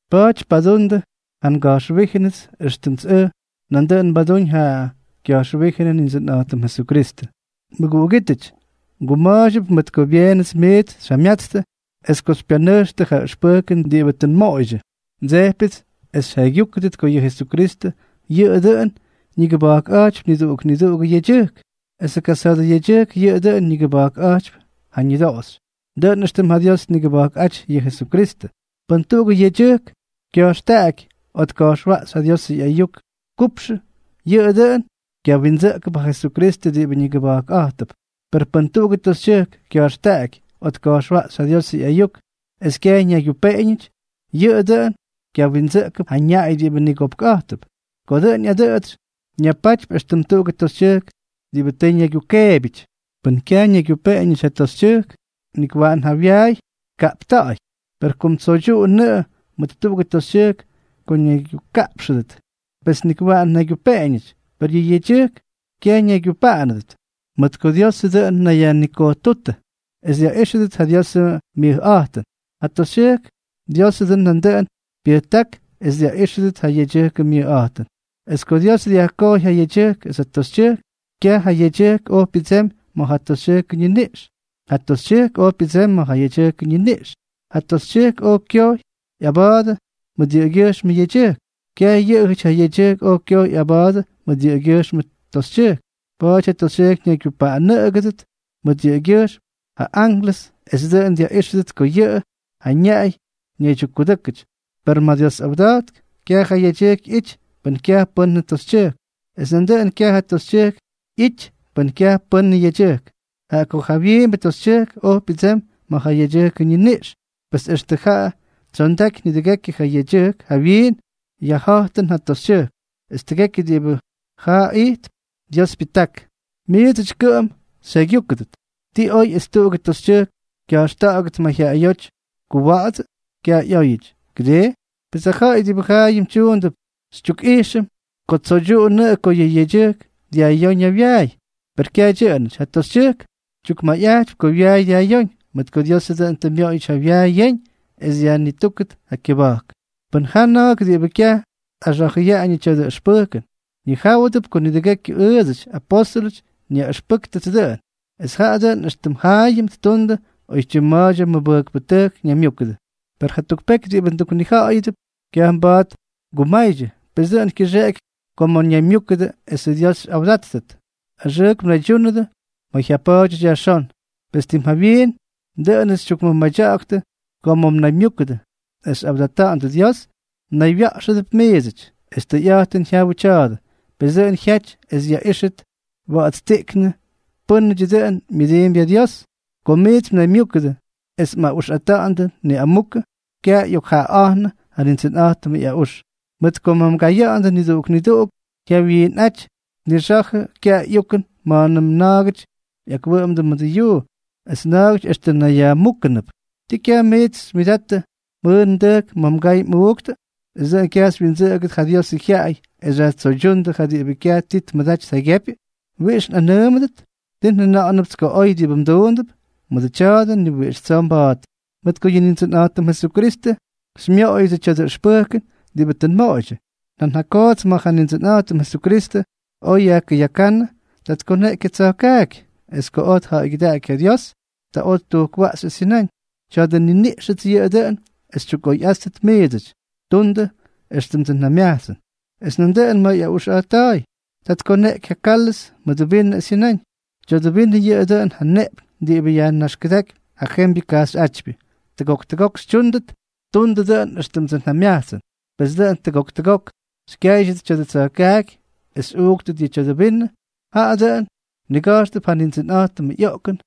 Pa̱a̱ty padundʉ ja nga̱jxwíjʉnʉts, éxtʉmts ʉj nandʉꞌʉn nbadúñ ja kya̱jxwíjʉnʉ Nindsʉnꞌa̱jtʉm Jesukristʉ. Mʉguꞌugítʉty, nguma̱a̱ydyʉp mʉt ko byeenʉts miits xyjamyatstʉ es ko xypyanʉjxtʉ ja ʉxpʉjkʉn diꞌibʉ tʉ nmoꞌoydyʉ. Ndsejpyʉts es xyjaygyúkʉdʉt ko yʉ Jesukristʉ yʉꞌʉ dʉꞌʉn ñigʉba̱jkꞌa̱jtypy niduꞌuk niduꞌugʉ yedyʉjk, esʉ kasa̱a̱dʉ yedyʉjk yʉꞌʉ dʉꞌʉn ñigʉba̱jkꞌa̱jtypy ja ñʉdoꞌoxy, dʉꞌʉn éxtʉm ja Dios tnigʉba̱jkꞌáty yʉ Jesukristʉ. Pʉn tuꞌugʉ yedyʉjk kya̱jxtaꞌaky o tka̱jxwaꞌxy ja Diosʉ ꞌyayuk kupxʉ, yʉꞌʉ dʉꞌʉn kyawindsʉꞌkʉp ja Jesukristʉ diꞌibʉ nigʉba̱jkꞌa̱jtʉp; per pʉn tuꞌugʉ toxytyʉjk kya̱jxtaꞌaky o tka̱jxwaꞌxy ja Diosʉ ꞌyayuk es kyaj ñaygyupeꞌeñʉty, yʉꞌʉ dʉꞌʉn kyawindsʉꞌkʉp ja ñaꞌay diꞌibʉ nigopkꞌa̱jtʉp. Ko dʉꞌʉn ꞌyadʉꞌʉtsy, ñapatypy éxtʉm tuꞌugʉ toxytyʉjk diꞌibʉ tʉ ñaygyukeebyʉty. Pʉn kyaj ñaygyupeꞌeñʉty ja toxytyʉjk, nik waꞌan ja wyaay tkaꞌpta̱ꞌa̱y. Per kom tsoydyuꞌunʉꞌʉ mʉt tuꞌugʉ toxytyʉjk ko ñaygyukaꞌpxʉdʉt, pes nik waꞌan tnaygyupeꞌeñʉty; per yʉ yedyʉjk kyaj ñaygyupaꞌanʉdʉt, mʉt ko Diosʉ dʉꞌʉn ñayyajnikojtútʉ es dyaꞌíxʉdʉt ja Diosʉ myʉjꞌa̱jtʉn. Ja toxytyʉjk, Diosʉ dʉꞌʉn nandʉꞌʉn pyʉjták es dyaꞌíxʉdʉt ja yedyʉjkʉ myʉjꞌa̱jtʉn, es ko Dios dyajkojy ja yedyʉjk es ja toxytyʉjk, kyaj ja yedyʉjk oj pyʉdsemy ma̱ ja toxytyʉjkʉ ñiniꞌx, ja toxytyʉjk oj pyʉdsemy ma̱ ja yedyʉjkʉ ñiniꞌx. Ja toxytyʉjk oj kyojy ꞌyaba̱a̱dʉ mʉt yʉꞌʉgyʉjxmʉ yedyʉjk. Kyaj yʉꞌʉjʉty ja yedyʉjk oj kyojy ꞌyaba̱a̱dʉ mʉt yʉꞌʉgyʉjxmʉ toxytyʉjk. Pa̱a̱ty ja toxytyʉjk ñaygyupaꞌanʉdʉt mʉt yʉꞌʉgyʉjxm ja ánklʉsʉty, es dʉꞌʉn dyaꞌíxʉdʉt ko yʉꞌʉ ja ñaꞌay ñaydyukkʉdʉ́kʉty. Per ma̱ yʉ Dios awda̱jtk, kyaj ja yedyʉjk ꞌyity pʉn kyaj pʉ́n toxytyʉjk, es nandʉꞌʉn kyaj ja toxytyʉjk ꞌyity pʉn kyaj pʉ́n yedyʉjk. Jaꞌa ko ja jawyiimbʉ toxytyʉjk oj pyʉdsemy ma̱ ja yedyʉjkʉ ñiniꞌx, pes extʉ jaa tsyondaky nidʉgekyʉ ja yedyʉjk yajmiin yajja̱jtʉn ja toxytyʉjk; es tʉgekyʉ diꞌibʉ jaa ijtp, Dios pyʉjták. Miidsʉty kʉꞌʉm xyjaygyúkʉdʉt. ¿Tii oy es tuꞌugʉ toxytyʉjk kya̱jxta̱ꞌa̱gʉt mayjyaꞌayóty kuwa̱ꞌa̱dsʉ? Kyaj ꞌyóyʉty, ¿kʉdii? Pes ja ja̱ꞌa̱y diꞌibʉ jaayʉm tyuundʉp xytyukꞌijxʉm ko tsoydyuꞌunʉꞌʉ ko yʉ yedyʉjk dyajꞌyóñ ja wyaay; per kyaj dyʉꞌʉnʉty ja toxytyʉjk, tyukmʉjꞌa̱jtypy ko wyaay dyajꞌyóñ, mʉt ko Diosʉ dʉꞌʉn tʉ myoꞌoyʉty ja wyaay yeñ es dyajnitúkʉt ja kyʉba̱jk. Pʉn jaa na̱a̱k diꞌibʉ kyaj tꞌaxa̱jʉyaꞌañʉ tya̱dʉ ʉxpʉjkʉn, ñijáwʉdʉp ko nidʉgekyʉ ʉʉdsʉty, apóstʉlʉty, nyaꞌʉxpʉ́ktʉts dʉꞌʉn, es jaꞌa dʉꞌʉn éxtʉm jaayʉm ttundʉ oytyim ma̱a̱dyʉ mʉbʉjkpʉtʉjk ñaymyúkʉdʉ. Per jatuk peky diꞌibʉ nduknija̱ꞌa̱yʉdʉp, kyaj mba̱a̱t ngumaydyʉ, pes dʉꞌʉn kyʉxeꞌeky ko ma̱ mnaymyúkʉdʉ esʉ Dios xyꞌawdáttʉt, axʉʉk mnaydyúnʉdʉ ma̱ jyapa̱a̱dyʉty yajxón. Pes tim jawyiin, dʉꞌʉnʉts xytyukmʉmadya̱ꞌa̱ktʉ ko ma̱ mnaymyúkʉdʉ es xyꞌawdata̱ꞌa̱ndʉ Dios, mnaywya̱ꞌxʉdʉp miidsʉty. Es tʉyꞌa̱jtʉn jyawʉ tya̱a̱dʉ. Pes dʉꞌʉn jyaty es yaꞌíxʉt wa̱ꞌa̱tstiꞌknʉ pʉ́nʉdyʉ dʉꞌʉn myʉdiimpy ja Dios. Ko miits mnaymyúkʉdʉ es mꞌaꞌuxꞌata̱ꞌa̱ndʉ niꞌamukʉ, kyaj ꞌyokjaꞌaꞌa̱jnʉ ja Nindsʉnꞌa̱jtʉmʉ ꞌyaꞌux. Mʉt ko ma̱ mgaya̱ꞌa̱ndʉ, niduꞌuk niduꞌuk jyawyinꞌaty tnixa̱jʉ kyaꞌay ꞌyukʉn ma̱a̱nʉm na̱a̱gʉty ꞌyakwʉꞌʉmdʉ mʉdʉ yuu, es na̱a̱gʉty extʉ nayyajmúkʉnʉp. ¿Tii kyaj miits xymyʉdattʉ mjʉʉn mdʉjk ma̱ mgay mꞌuuktʉ, es dʉꞌʉn kyaj xywyindsʉꞌʉgʉdʉ ja Diosʉ jyaꞌay es xyajtsoydyúndʉ ja diꞌibʉ kyaj ti tmʉdaty tjaygyepy? ¿Wiꞌix nꞌanʉʉmʉdʉt? ¿Tii njʉna̱ꞌa̱nʉpts ko oy diꞌibʉ mduundʉp? ¡Mʉdʉ tya̱a̱dʉ, ni wiꞌix tsoo mba̱a̱t! Mʉt ko yʉ Nindsʉnꞌa̱jtʉm Jesukristʉ xymyooyʉdsʉ tya̱dʉ ʉxpʉjkʉn diꞌibʉ tʉ nmoꞌoydyʉ. Nan ja koots ma̱ ja Nindsʉnꞌa̱jtʉm Jesukristʉ oj yajkʉyakánnʉ, ta tkoneꞌky ja tsa̱jkaaky, es ko tja̱ꞌa̱ygyʉdáky ja Dios, ta oj ttujkwaꞌxy es jyʉnáñ: “Tya̱dʉ nniniꞌxʉts yʉꞌʉ dʉꞌʉn es xytyukꞌoyꞌáttʉt miidsʉty. Tundʉ dʉꞌʉn éxtʉmdsʉ njamyajtsʉn.” Es nandʉꞌʉn ma̱ ꞌyaꞌuxꞌa̱jtta̱a̱y, ta tkoneꞌky ja kálʉz mʉdʉ vinʉ es jyʉnáñ: “Tya̱dʉ vinʉ yʉꞌʉ dʉꞌʉn ja nneꞌpyñ diꞌibʉ yajnaxkʉdákypy ja jembyʉ kajxyꞌátypyʉ. Tʉgok tʉgok xyꞌuuktʉt, tundʉ dʉꞌʉn éxtʉmdsʉ njamyajtsʉn.” Pes dʉꞌʉn tʉgok tʉgok xykyáydyʉt tya̱dʉ tsa̱jkaaky es xyꞌuuktʉt ja tya̱dʉ vinʉ, jaꞌa dʉꞌʉn mniga̱jxtʉp ja Nindsʉnꞌa̱jtʉmʉ ꞌyoꞌkʉn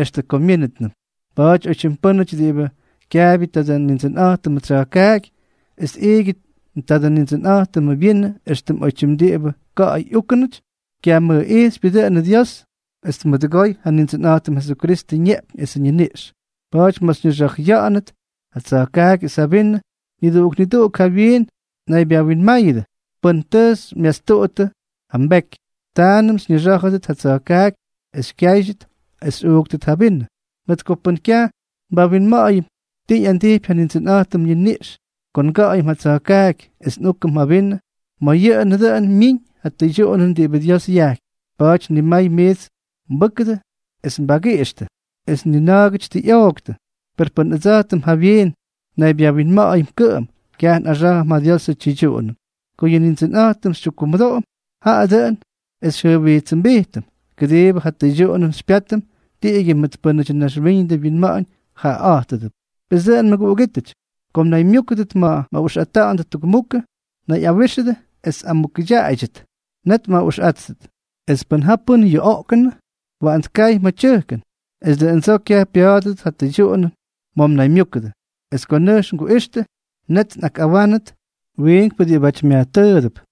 extʉ ko myínʉtnʉm. Pa̱a̱ty oytyim pʉ́nʉty diꞌibʉ kyaabyʉ tadʉ Nindsʉnꞌa̱jtʉmʉ tsya̱jkaaky es tꞌiigyʉ tadʉ Nindsʉnꞌa̱jtʉmʉ vyinʉ éxtʉm oytyim diꞌibʉ ka̱ꞌa̱y úkʉnʉty, kyamʉjꞌijxypyʉ dʉꞌʉnʉ Dios es tmʉdʉgoy ja Nindsʉnꞌa̱jtʉm Jesukristʉ ñeꞌpyñ esʉ ñiniꞌx. Pa̱a̱ty ma̱ xyñixa̱jʉya̱ꞌa̱nʉt ja tsa̱jkaaky es ja vinʉ, niduꞌuk niduꞌuk jawyiin mnaybyawinmáyʉdʉ pʉn tʉ xymyastuꞌuttʉ ja mbeky, taanʉm xyñixá̱jʉdʉt ja tsa̱jkaaky es xykyáydyʉt es xyꞌuuktʉt ja vinʉ. Mʉt ko pʉn kyaj nbawinma̱ꞌa̱yʉm ti ꞌyandijpy ja Nindsʉnꞌa̱jtʉmʉ ñiniꞌx ko nga̱ꞌa̱yʉm ja tsa̱jkaaky es nꞌúkʉm ja vinʉ, ma̱ yʉꞌʉnʉ dʉꞌʉn myiñ ja tʉydyuꞌunʉn diꞌibʉ Dios yajkypy. Pa̱a̱ty nimay miits mbʉ́kʉdʉ es mbagiꞌixtʉ, es nigana̱a̱gʉty tʉ ꞌyooktʉ. Per pʉn ʉdsa̱jtʉm jawyiin nnaybyawinma̱ꞌa̱yʉm kʉꞌʉm, kyaj nꞌaxá̱jʉm ja Diosʉ tyʉydyuꞌunʉn. Ko yʉ Nindsʉnꞌa̱jtʉm xytyukkumʉdoꞌom, jaꞌa dʉꞌʉn es xyjʉjwijtsʉmbijtʉm, kʉdiibʉ ja tʉydyuꞌunʉn xypyátʉm tiꞌigyʉ mʉt pʉ́nʉdyʉ naxwíñʉdʉ winma̱ꞌa̱ñ jaꞌaꞌa̱jtʉdʉp. Pes dʉꞌʉn mʉguꞌugítʉty, ko mnaymyúkʉdʉt ma̱ mꞌaꞌuxꞌata̱ꞌa̱ndʉ tukmukʉ, nayꞌawíxʉdʉ es mꞌamukʉdyaꞌaydyʉt, net mꞌaꞌuxꞌáttʉt. Es pʉn ja pʉ́n yuꞌoꞌkʉnʉ, waꞌan tkay ma̱ tyʉjkʉn, es dʉꞌʉndsoo kyaj pya̱a̱dʉdʉt ja tʉydyuꞌunʉn ma̱ mnaymyúkʉdʉ. Es ko nʉjx nguꞌixtʉ, net nꞌakꞌawánʉdʉt wiinkpʉ diꞌibáty myajtʉʉdʉp.